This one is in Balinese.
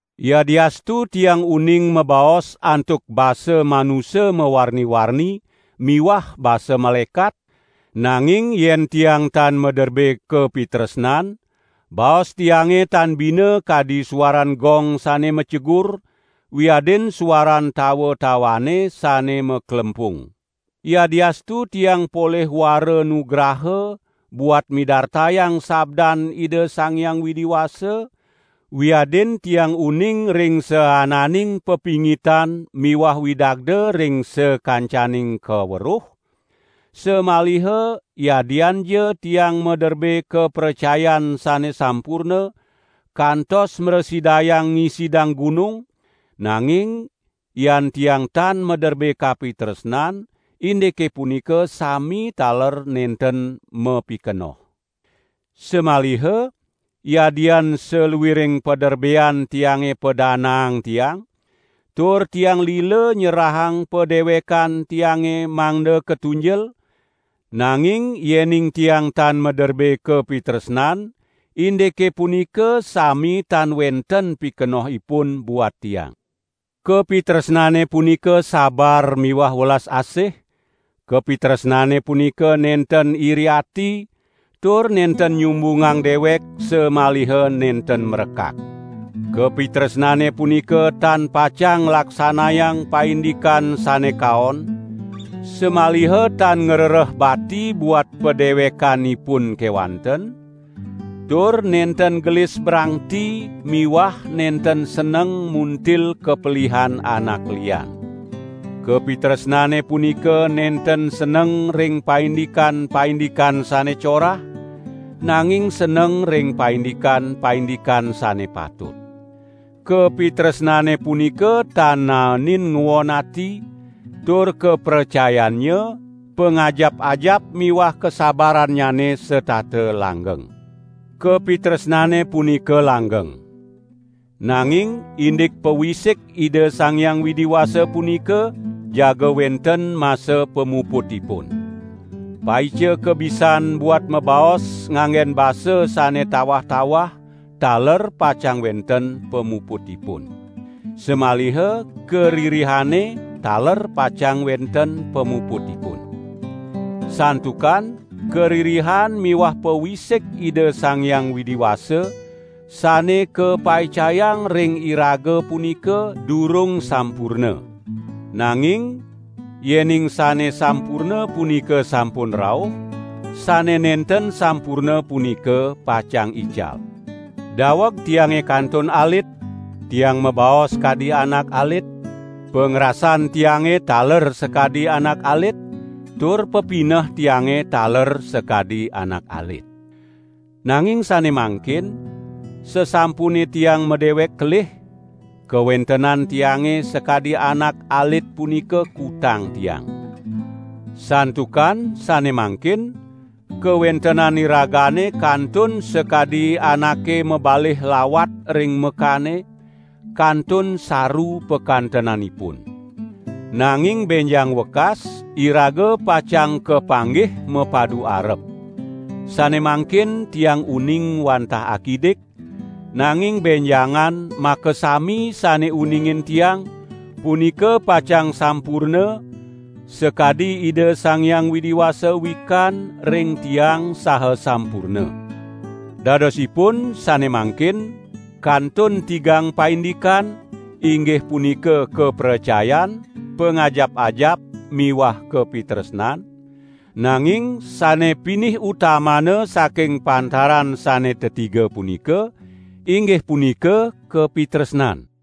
Yadiastu tiang uning mabaos antuk basa manusa mawarni-warni miwah basa malaekat, nanging yen tiang tan maderbe kapitresnan, baos tiange tan bina kadi suaran gong sane macegur wiadin suaran tawa-tawane sane maklempung. Yadiastu tiang polih wara nugraha buat midartayang sabdan Ida Sang Hyang Widi Wasa, wiadin tiang uning ring saananing pepingitan miwah widagda ring sakancaning kaweruh, samaliha yadianja tiang maderbe kapracayan sane sampurna, kantos mrasidayang ngisidang gunung, nanging yan tiang tan maderbe kapitresnan, indike punika sami taler nenten mapikenoh. Samaliha yadian saluiring paderbean tiange padanaang tiang, tur tiang lila nyerahang padewekan tiange mangda katunjel, nanging yening tiang tan maderbe kapitresnan, indike punika sami tan wenten pikenohipun buat tiang. Kapitresnane punika sabar miwah welas asih; kapitresnane punika nenten iri ati tur nenten nyumbungang dewek samaliha nenten mrekak. Kapitresnane punika tan pacang nglaksanayang paindikan sane kaon, samaliha tan ngrereh bati buat padewekanipun kewanten, tur nenten gelis brangti miwah nenten seneng muntil kapelihan anak lian. Kapitresnane punika nenten seneng ring paindikan-paindikan sane corah, nanging seneng ring paindikan-paindikan sane patut. Kapitresnane punika tan naenin nguon ati, tur kapracayannya, pangajap-ajap miwah kasabarannyane setata langgeng. Kapitresnane punika langgeng. Nanging indik pawisik Ida Sang Hyang Widi Wasa punika jaga wenten masa pamuputipun. Paica kabisan buat mabaos nganggen basa sane tawah-tawah taler pacang wenten pamuputipun. Samaliha karirihane taler pacang wenten pamuputipun. Santukan karirihan miwah pawisik Ida Sang Hyang Widi Wasa sane kapaicayang ring iraga punika durung sampurna. Nanging yening sane sampurna punika sampun rauh, sane nenten sampurna punika pacang ical. Daweg tiange kantun alit, tiang mabaos kadi anak alit, pangrasan tiange taler sakadi anak alit, tur pepineh tiange taler sakadi anak alit. Nanging sane mangkin sasampune tiang madewek kelih, kawentenan tiange sakadi anak alit punika kutang tiang. Santukan sane mangkin kawentenan iragane kantun sakadi anake mabalih lawat ring mekane, kantun saru pakantenanipun. Nanging benjang wekas, iraga pacang kapanggih mapadu arep. Sane mangkin tiang uning wantah akidik, nanging benjangan makasami sane uningin tiang, punika pacang sampurna sakadi Ida Sang Hyang Widi Wasa wikan ring tiang saha sampurna. Dadosipun sane mangkin kantun tigang paindikan inggih punika kapracayan, pangajap-ajap miwah kapitresnan; nanging sane pinih utamana saking pantaran sane tetiga punika, inggih punika kapitresnan.